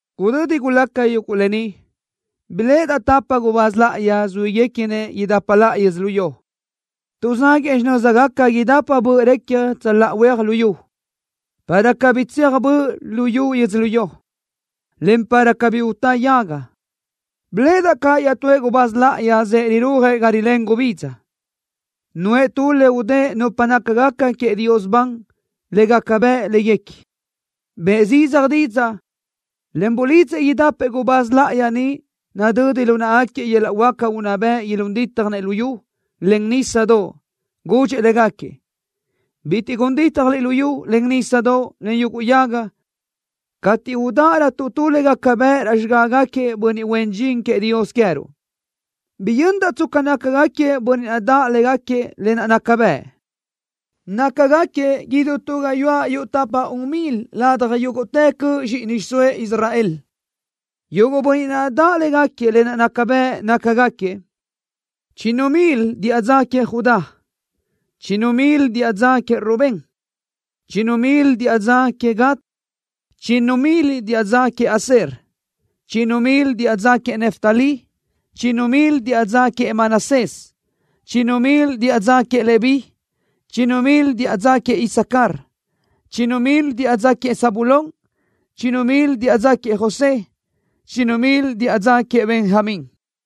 Gudödi gulaca yuguʼ lë ni biléʼedaʼ tapa gubáz láʼayi zuíguequinëʼ idapa laʼa yödzölió. Tuʼzáguëʼë xinö́zgaca idapa böʼ recja tsöláʼa huéaj luyú, para cabí tsecja böʼ luyú yödzölió, en para cabí tsecja lu nísadoʼ, en para cabí utá yaga. Biléʼedaʼ caʼ iaʼtúëʼ gubáz láʼayi zëʼë rirúajëʼ ga rilén gubidza. Nuʼë tu le udë́ʼë nupa nácagaca queëʼ Dios ban le gaca bëʼ léguequi. Bëʼë zidzaj didzaʼ, en bulidzëʼ idapëʼ gubáz láʼayi niʼ nadödi lu náʼagaquiëʼ yöl-laʼ huáca unná bëʼ ilún dítjanëʼ luyú, en nísadoʼ. Gudxëʼ légaquiëʼ: “Bitiʼ gun dítjaliʼ luyú, en nísadoʼ, en yuguʼ yaga cateʼ udáʼarötuʼ tu le gaca bëʼ raʼ xigágaquiëʼ bönniʼ huen dxin queëʼ Dios queë́ruʼ.” Biyöndaʼ tsca nácagaquiëʼ bönniʼ daʼ légaquiëʼ lë naʼ naca bëʼ. Nácagaquiëʼ idú tu gayuáʼ yuʼ tapa-un milëʼ ladaj yúguʼtë cöʼ zxíʼini xiʼsóëʼ Israel. Yuguʼ bönniʼ naʼ daʼ légaquiëʼ lë naʼ naca bëʼ nácagaquiëʼ: Chinnu milëʼ diʼa dza queëʼ Judá. Chinnu milëʼ diʼa dza queëʼ Rubén. Chinnu milëʼ diʼa dza queëʼ Gad. Chinnu milëʼ diʼa dza queëʼ Aser. Chinnu milëʼ diʼa dza queëʼ Neftalí. Chinnu milëʼ diʼa dza queëʼ Manasés. Chinnu milëʼ diʼa dza queëʼ Leví. Chinnu milëʼ diʼa dza queëʼ Isacar. Chinnu milëʼ diʼa dza queëʼ Zabulón. Chinnu milëʼ diʼa dza queëʼ José. Chinnu milëʼ diʼa dza queëʼ Benjamín.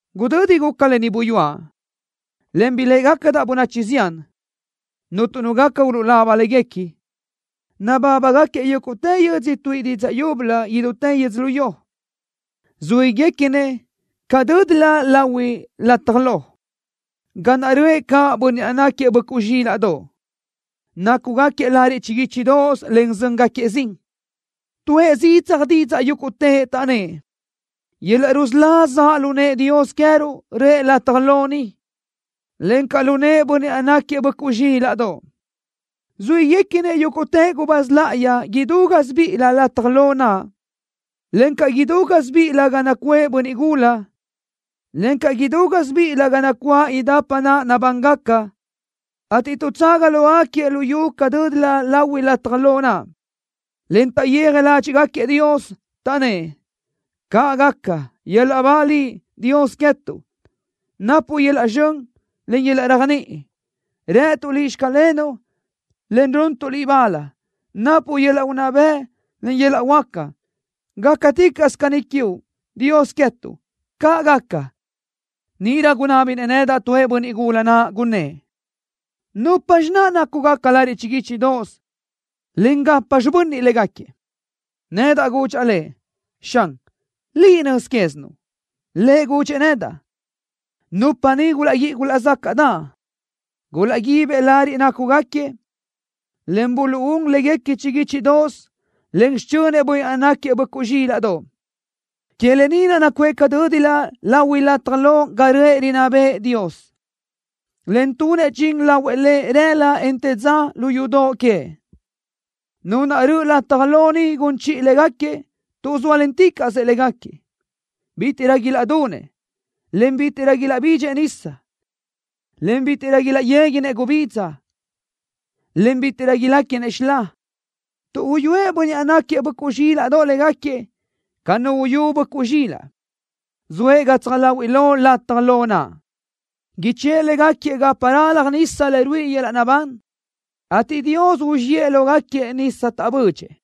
Gudödi guca lë ni buyúaʼ, en biléʼegacadaʼ bönachi zián, cuntu nu gaca ulaba léguequi. Nabábagaquiëʼ yúguʼtë yödzö tuíʼi didzaʼ yúbölö idútë yödzölió. Zuíguequinëʼ ca dö́dilö lahui lataj lo, ga naʼ röʼë caʼ Bönniʼ naʼ náquiëʼ Böʼcuʼ Zxílaʼdoʼ, en nácugaquiëʼ lariʼ chiguíchidoʼos, en zö́ngaquiëʼ zin. Tuʼë zidzaj didzaʼ yúguʼtëʼ, taʼnnë́ʼ: ¡Yöl-laʼ rusölá zaʼ lu nëʼë Dios queë́ruʼ, röʼë lataj lo ni, en zaʼ caʼ lu nëʼë Bönniʼ naʼ náquiëʼ Böʼcuʼ Zxílaʼdoʼ! Zuíguequinëʼ yúguʼtë gubáz láʼayi idú gásibiʼilö lataj lo naʼ, encaʼ idú gásibiʼilö ga nacuʼë bönniʼ gula, encaʼ idú gásibiʼilö ga nacuáʼ idapa naʼ nabángaca, ateʼ tuʼtsaga lógaquiëʼ lu yu ca dö́dilö lahui lataj lo naʼ, en taʼyéaj ládxiʼgaquiëʼ Dios, taʼnnë́ʼ: ¡Caʼ gaca! ¡Yöl-laʼ ba Liʼ, Dios queë́tuʼ! ¡Napuʼ yöl-laʼ zxön, en yöl-laʼ réajniʼi! ¡Rëtuʼ Liʼ: “Xclenuʼ”, en runtuʼ Liʼ bal! ¡Napuʼ yöl-laʼ unná bëʼ, en yöl-laʼ huáca! ¡Gácaticaʼsö caní quiuʼ, Dios queë́tuʼ! ¡Caʼ gaca! Níʼirö gunábinëʼ nedaʼ tuëʼ bönniʼ gula naʼ, gunnë́ʼ: “¿Nupxi naʼ nácugaca lariʼ chiguíchidoʼos, en gapxi bönniʼ légaquiëʼ?” Nedaʼ gudxaʼ lëʼ: “Xan, liʼ nöz quézinuʼ.” Lëʼ gudxëʼ nedaʼ: “Nupa ni gulaʼguíʼi gulaʼzácaʼdaʼ. Gulaʼguíbëʼ lariʼ nácugaquiëʼ, en buluʼún léguequi chiguíchidoʼos len xichönëʼ Bönniʼ naʼ náquiëʼ Böʼcuʼ Zxílaʼdoʼ. Que lë ni naʼ nacuʼë ca dö́dilö lahui lataj lo ga röʼë rinná bëʼë Dios, en tunëʼ dxin lahuëʼ Lëʼ rëla, en të dza lu yudoʼ queëʼ. Nu naʼ röʼö lataj lo ni gun chiʼi légaquiëʼ tuʼ zóalenticaʼsö légaquiëʼ. Bítiʼrö ilaʼdunëʼ, en bítiʼrö ilaʼbidxëʼ nisa, en bítiʼrö ilaʼyéguinëʼ gubidza, en bítiʼrö iléquinëʼ xilá tuʼ uyúëʼ Bönniʼ naʼ náquiëʼ Böʼcuʼ Zxílaʼdoʼ légaquiëʼ ca nu uyú böʼcuʼ zxilaʼ. Zoëʼ gatsaj láhuiʼlö lataj lo naʼ. Ichë́ʼë légaquiëʼ gapa ralaj nisa le ruíʼi yöl-laʼ naʼbán, ateʼ Dios uzxíëʼ lógaquiëʼ nisa taʼbödxëʼ.”